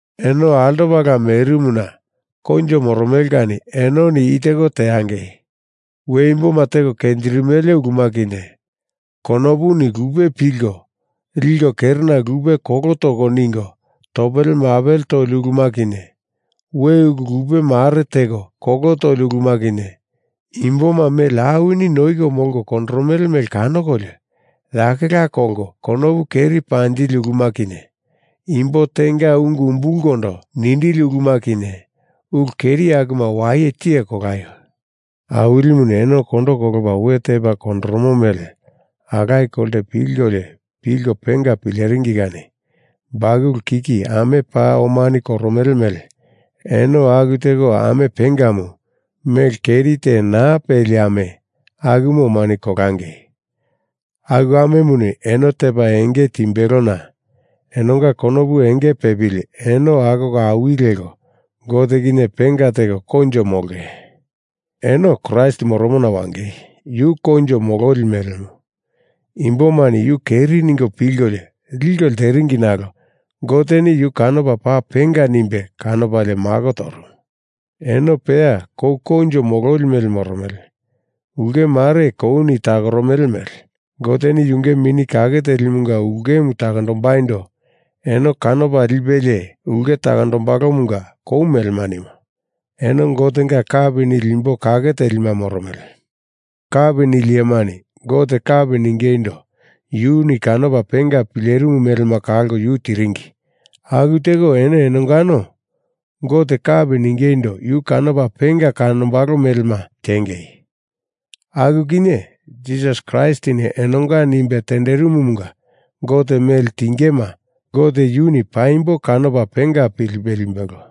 Eno altopala merimuna koinjo moromele kani enoni i teko teangei: We imboma teko kenjirimele uluma kinye, konopuni lupe pilko liko kerena lupe kolo toko ningo topele mapele toli uluma kinye, we ulu lupe mare teko kolo toli uluma kinye, imboma mele awini noiko molko kondoromele mele kanokolio yakela kolko konopu keri panjili uluma kinye, imbo tenga ungu umbulkondo nindili uluma kinye, ulu keri akuma waye tiye kolaio. Awilimuni eno kondo kolopa we tepa kondoromo mele alaye kolte pilkolio pilko penga pileringi kani bakulu kiki ame paa omani koromele mele eno aku teko ame pengamu, mele keri te naa peli ame, akumu omani kolangei. Aku amemuni eno tepa enge timbelona enonga konopu enge pepili eno akoko awili leko Gote kinye penga teko koinjo molonge. Eno Kraist moromona wangei. Yu kou koinjo mololi melemu. Imbomani yu keri ningo pilkolio liko lteringi nalo Goteni yu kanopa paa penga nimbe kanopalie mako torumu. Eno peya kou koinjo mololi mele moromele. Ulke mare kouni takoromele mele Goteni yunge Mini Kake Telimunga ulkemu takondombaindo eno kanopa lipelie ulke takombalomunga kou melema nimo. Eno Gotenga kapi nili imbo kake telima moromele. Kapi nili iyemani Gote kapi ningeindo yuni kanopa penga pilerimu melema kalko yu tiringi aku teko eno enongano Gote kapi ningeindo yu kanopa penga kanombalo melema tiengei. Aku kinye, Jisas Kraistini enonga nimbe tenderimumunga Gote mele tingema Gote yuni paimbo kanopa penga pilipe limbelo.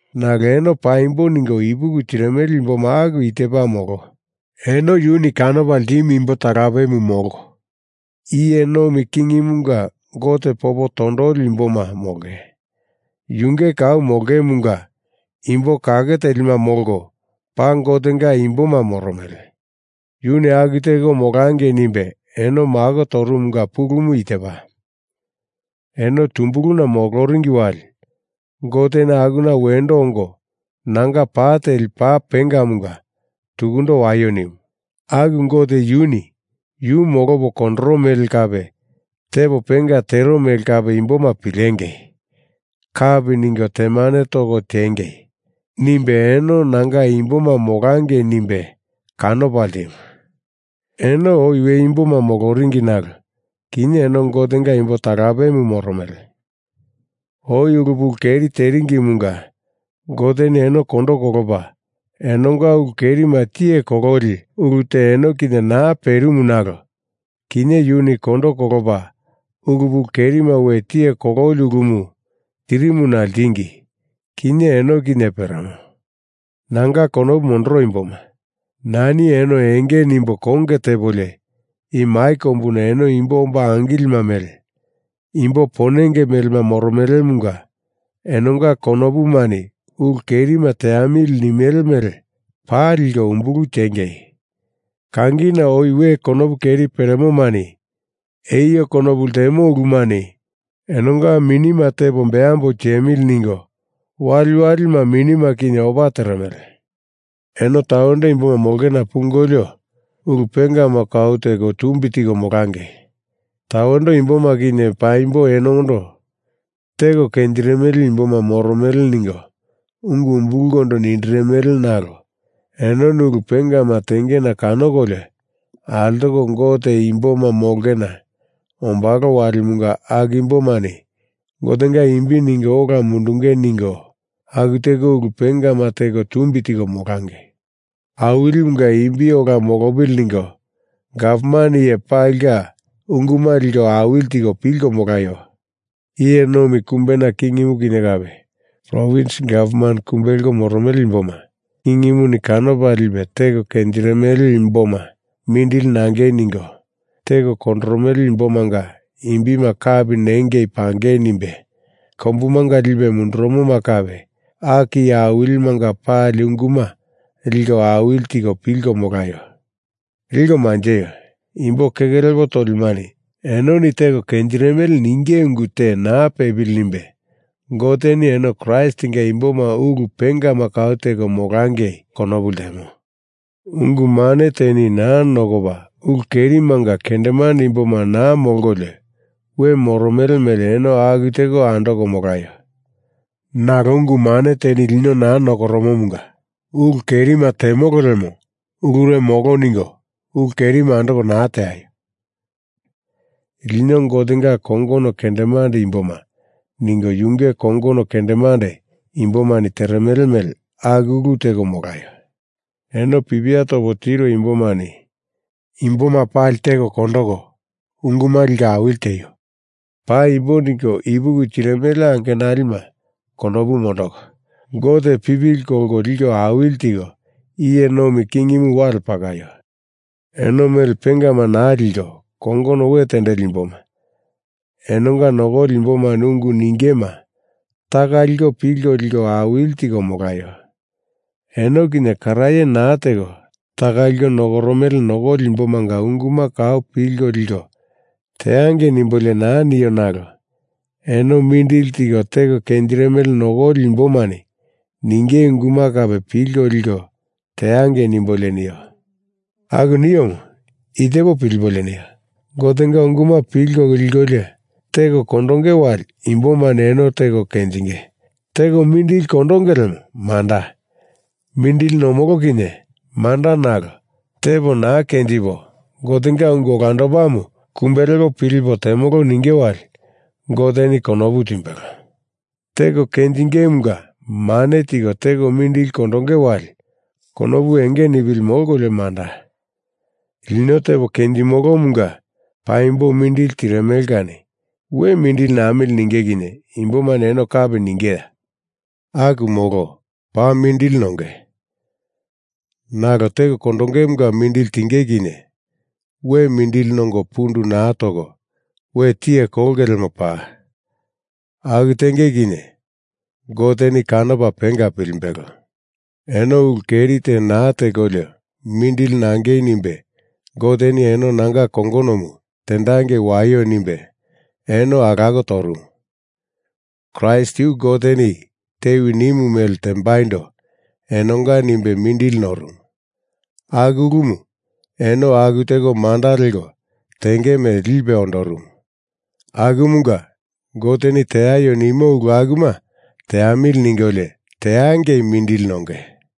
Nalo eno Paimbo ningo ipuki tirimele imboma aku tepa molo. Eno yuni kanopa ltimu imbo talapemu molko, iye nomi kingimunga Gote popo tondoli imboma molko, yunge kau molongemunga imbo kake telima molko, paa Gotenga imboma moromele. Yuni aku teko molangei nimbe eno mako torumumunga pulumu i tepa: eno tumbuluna moloringi wali Goteni akuna wendo ongo nanga pa teli paa pengamunga tukundo waio nimu. Aku Gote Yuni Yu molopo kondoro mele kape tepo penga tero mele kape imboma pilengei kapi ningo temane toko tiengei nimbe eno Nanga imboma molangei nimbe kanopa ltimu. Eno oi we imboma moloringi nalo kinye eno Gotenga imbo talapemu moromele. Oi ulu pulu keri teringimunga Goteni eno kondo kolopa enonga ulu kerima tiye kololi ulu te eno kinye naa perimu nalo kinye yuni kondo kolopa ulu pulu kerima we tiye kololi ulumu tirimuna ltingi. Kinye eno kinye peremo. Nanga konopu mondoro imboma, nani eno enge nimbo konge tepolio i mai kombuna eno imbo omba angilima mele, imbo ponenge mele moromelemunga enonga konopumani ulu kerima teamili nimele mele paa liko umbulu tiengei. Kangina oi we konopu keri peremomani eio konopu ltemo ulumani enonga minima tepo beambo tiemili ningo waliwalima minima kinye opa teremele. Eno tawendo imboma molongena pungolio ulu pengama kau teko tumbi tiko molangei. Tawendo imbomani kinye paimbo enondo teko kenjirimele imboma moromele ningo ungu umbulkondo nindirimele nalo enoni ulu pengama tengena kanokolio altoko Gote imboma molongena ombalo walimunga aku imbomani Gotenga imbi ningo ola mundengei ningo aku teko ulu pengama teko tumbi tiko molangei. Awilimunga imbi ola molopili ningo gavman iye palinga unguma liko awili tiko pilko molaio. Iye nomi kumbena kingimu kinye kape, provins gavman kumbe leko moromele imboma kingimuni kanopa lipe teko kenjirimele imboma mindili nangei ningo, teko kondoromele imbomanga imbima kapi nengei pangei nimbe kombumanga lipe mundurumoma kape, aku iye awilimanga pali unguma liko awili tiko pilko molaio. Liko manjeio, imbo keke lepo tolimani enoni teko kenjirimele ninge ungu te naa pepili nimbe Goteni eno Kraistinga imboma ulu pengama kau teko molangei konopu ltemo. Ungu mane teni naa nokopa ulu kerimanga kendemande imboma naa molkolio we moromele mele eno aku teko andoko molaio. Nalo ungu mane teni lino naa nokoromomunga ulu kerima temolo lemo ulure molo ningo ulu kerima andoko naa teaio. Lino Gotenga kongono kendemande imboma ningo yunge kongono kendemande imbomani teremele mele aku ulu teko molaio. Eno pipia topo tiro imbomani imboma pali teko kondoko, unguma liko awili tieio. Paimbo ningo ipuki tirimele angenalima konopu mondoko, Gote pipili kolko liko awili tiko, iye nomi kingimu wale pakaio. Eno mele pengama naa liko kongono we tendeli imboma, enonga nokoli imbomani ungu ningema taka liko pilko liko awili tiko molaio. Eno kinye karaye naa teko taka liko nokoromele nokoli imbomanga unguma kau pilko liko teangei nimbolio naa nio nalo eno mindili tiko teko kenjirimele nokoli imbomani ninge unguma kape pilko liko teangei nimbolio nio. Aku niomu i tepo pilipolio nio. Gotenga unguma pilko likolio teko kondonge wali imbomani eno teko kenjiko teko mindili kondonge lemo manda, mindili nomolo kinye manda nalo tepo naa kenjipo Gotenga ungu olandopamu kumbe lepo pilipo temolo ninge wali Goteni konopu timbelo. Teko kenjingemunga mane tiko teko mindili kondonge wali konopu enge nipili molkolio manda, lino tepo kenjimolomunga paimbo mindili tirimele kani we mindili namili ninge kinye imbomani eno kapi ningeya? Aku molo. Paa mindili nonge. Nalo teko kondongemunga mindili tinge kinye we mindili nongo pundu naa toko we tiye kolonge lemo paa. Aku tenge kinye Goteni kanopa penga pilimbelo. Eno ulu keri te naa tekolio mindili nangei nimbe Goteni eno nanga kongonomu tendangei waio nimbe eno alako torumu. Kraist yu Goteni tewi nimu mele tembaindo enonga nimbe mindili norumu, aku ulumu eno aku teko manda leko tenge mele lipe ondorumu. Akumunga Goteni teaio nimo ulu akuma teamili ningolio teangei mindili nonge.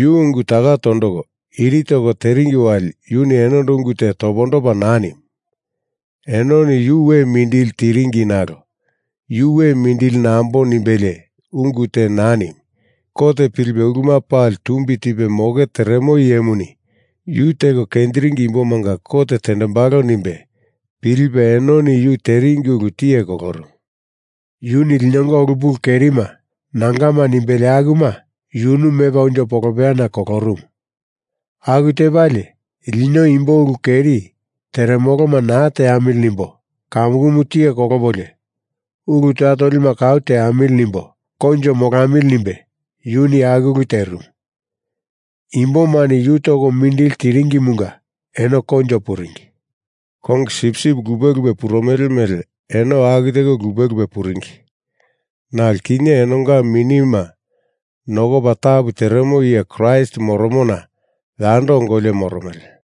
Yu ungu taka tondoko iri toko teringi wali yuni enondo ungu te topondopa naa nimu. Enoni yu we mindili tiringi nalo Yu we mindili nambo nimbelie ungu te naa nimu. Kot pilipe uluma pali tumbi tipe moke teremo Iyemuni yu teko kenjiringi imbomanga kot tendembalo nimbe pilipe enoni yu teringi ulu tiye kolorumu. Yuni linonga ulu pulu kerima Nangama nimbelie akuma yunu mepa unjo polopeyana kolorumu. Aku tepalie lino imbo ulu keri teremoloma naa teamili nimbo kamukumu tiye kolopolio ulu toya tolima kau teamili nimbo koinjo molamili nimbe yuni aku ulu terimu. Imbomani yu toko mindili tiringimunga eno koinjo puringi. Kongi sipsip lupe lupe purumele mele eno aku teko lupe lupe puringi, nalo kinye enonga minima nokopa tapu teremo iye Kraist moromona yando ongolio moromele.